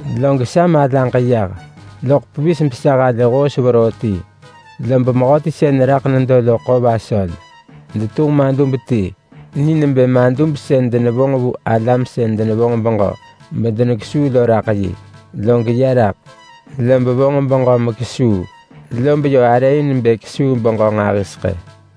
Log sa malaġ yah loḳ pevis besa halë hoos veroo ti, lob mehöti sën raḳ nedo lo ḳo vasöl. Detunġ madub ti ni nebë madub sën denevonġ vu alam sën denevonġ beġö medenekesuu lo raḳ yi. Log ya raḳ, lob vonġ beġö mekesuu, lob yö arë in bë kesuu beġö nġahiseḳë.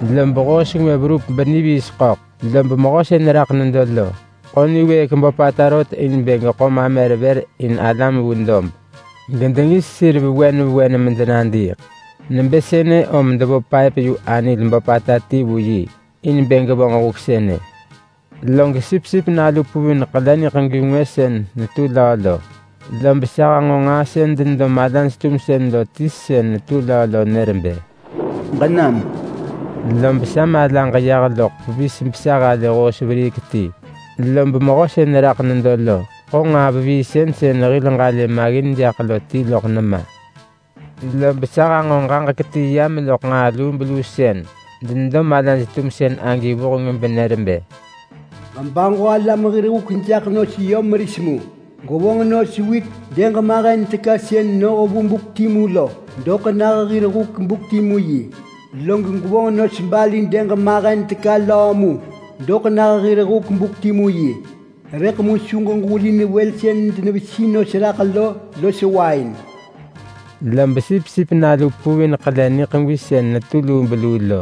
Lob hoos ngwë verup beniviis ḳöḳ. Lob mehö sën raḳ nedo lo ḳo niwëëk böpata rot in bë geḳo mamer vër in alam vu dob gedengis sir vewen vewen medenadiiḳ. Nebë sënë om devo paëp-yu-anil böpata ti vu yi in bë gevonġ huk sënë. Log Sipsip Nalu puvin ḳele niḳegwi ngwë sën netu löö lo, lob sa hanġo nġaa sën denedo malaj-tumsën lo ti sën netu löö lo nër bë, “Ġenam!” Lob sa malaġ yah loḳ pevis besa halë hoos veriik ti. Lob mehö sën raḳ nedo lo ḳo nġaa veviisën sën hil ġalë maggin jaḳ lo ti loḳ nema. Lob sa hanġo ġaġek ti yam loḳ nġaa lubeluu sën denedo malaj-tumsën agi vuheng benër bë, “Ġebaġo alam hir huk jaḳ nos yö meris mu. Gwevonġ nos wit dëg mahen teka sën noh vu buk timu lo doḳ nah hir huk buk timu yi. Log gwevonġ nos barli dëg mahen teka löö mu doḳ nah hir huk buk timu yi. Rëḳ mu su ġebasap wël sën denevesi nos raḳ lo los wain!” Log Sipsip Nalu puvin ḳele niḳegwi sën netu lubeluu lo,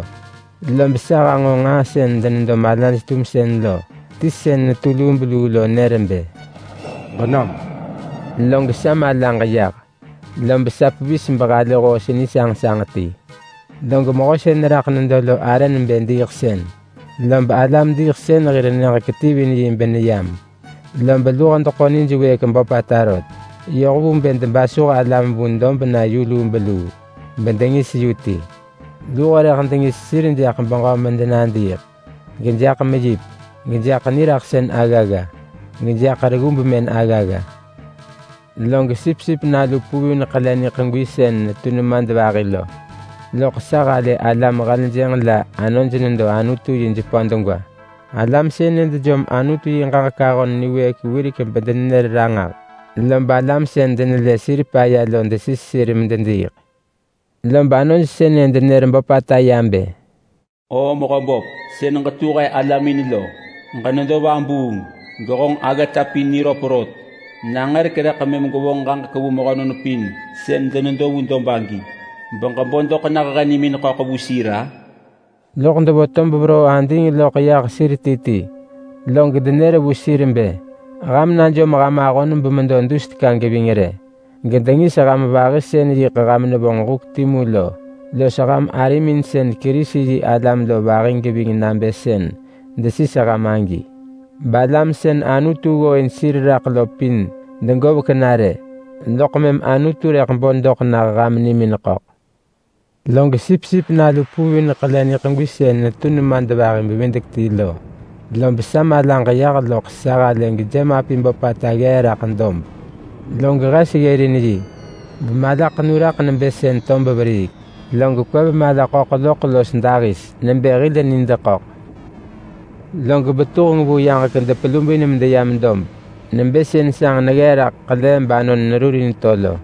lob sa hanġo nġaa sën denedo malaj-tumsën lo ti sën netu lubeluu lo nër bë, “Ġenam!” Log sa malaġ yah, lob sa pevis behalë hoos nisanġsanġ ti. Log mehö sën raḳ nedo lo arë nebë Diiḳsën. Lob Alam-diiḳsën-hir-nyëġ ketivin yi beneyam. Lob luho deḳo nij wëëk böpata rot yoh vu bë debasuh alam vu dob na yu lubeluu bedengis yu ti. Luho rëḳ dengis sir jaḳ beġö medenadiiḳ, gejaḳ meyip, gejaḳ niraḳsën aggagga, gejaḳ reggu bemën aggagga. Log Sipsip Nalu puvin ḳele niḳegwi sën netu nemadvahi lo, loḳ sa halë alam heljënġ la anoj nedo Anutu yi jepö degwa. Alam sënë dejom Anutu yi ġaġek ahon niwëëk wirek bedenenër ranġah, lob alam sën denelë sir paya lo desis sir medediiḳ. Lob anoj sënë denër böpata ya bë, “Oo Mehöböp sën ġetu he alamin lo, ġenedo vabuung, gehonġ aggata pin niröp rot! Nangërek rëḳ mëm gwevonġ ġaġek vu mehönon pin sën denedo vu dob agi beġebo doḳ nah he nimin ḳöḳ vu sir-a?” Loḳ devo tob veroo ading loḳ yah sir ti ti, log denër vu sir bë, “Ham najom ham ahon bemedo dus teka geving rë. Gedengis ham vahi sën yiḳ ham nevonġ huk timu lo los ham arimin sën Kerisi-yi-alam lo vahi geving nabë sën desis ham agi. Balam sën Anutu ggooin sir raḳ lo pin degovek na rë. Loḳ mëm Anutu rëḳ bo doḳ nah ham nimin ḳöḳ.” Log Sipsip Nalu puvin ḳele niḳegwi sën netu nemadvahi-bevidek-ti lo, lob sa malaġ yah loḳ sa halë gejemapi böpata ggee raḳ dob. Log hes ggërin yi bemalaḳenu raḳ nebë sën tob veriik. Log kwev mala ḳöḳ loḳ los dahis nebë hil nid ḳöḳ. Log betuheng vu yaġek depelubin medeyam dob nebë sën sanġ neggee raḳ ḳele banon nerurin to lo.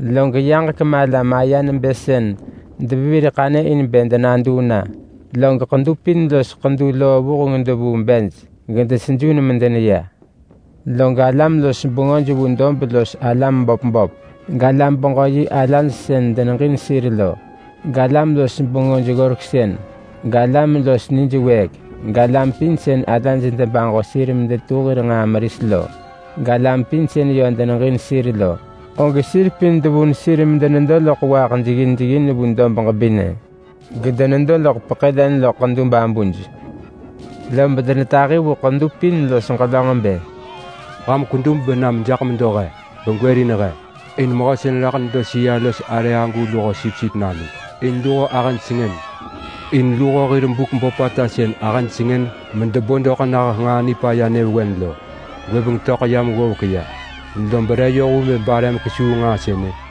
Log yaġek mala maya nebë sën devevir ḳanyë in denaduu na. Log ḳedu pin los ḳedu loo vuheng devuu bej gedesejun medeneya. Log alam-los-bengöj vu dob los alam böp böp, galam-beġö-yi alaj sën deneġin sir lo, galam-los-bengöj ggoreksën, galam los nij wëëk, galam pin sën alaj debaġo sir medetu hir nġaa meris lo, galam pin sën yö deneġin sir lo, og sir pin devun sir medenedo loḳ waaḳ jeggin jeggin vu dob ġebinë, gedenedo loḳ peḳë len loḳ ḳedu babuj. Lob denetahi vu ḳedu pin los ġelönġ bë, “Ham kwedub benam jaḳ medo he begwërin he in Mehö sën raḳ nedo sëa-los-arë agu luho Sipsip Nalu, in luho ahëj sengën. In luho hir buk böpata sën ahëj sengën medebo doḳ nah nġaa nipaya nyëvewen lo gwëbeng töḳ yam ggovek ya, lob re yoh vu bë bare mekesuu nġaa sënë?”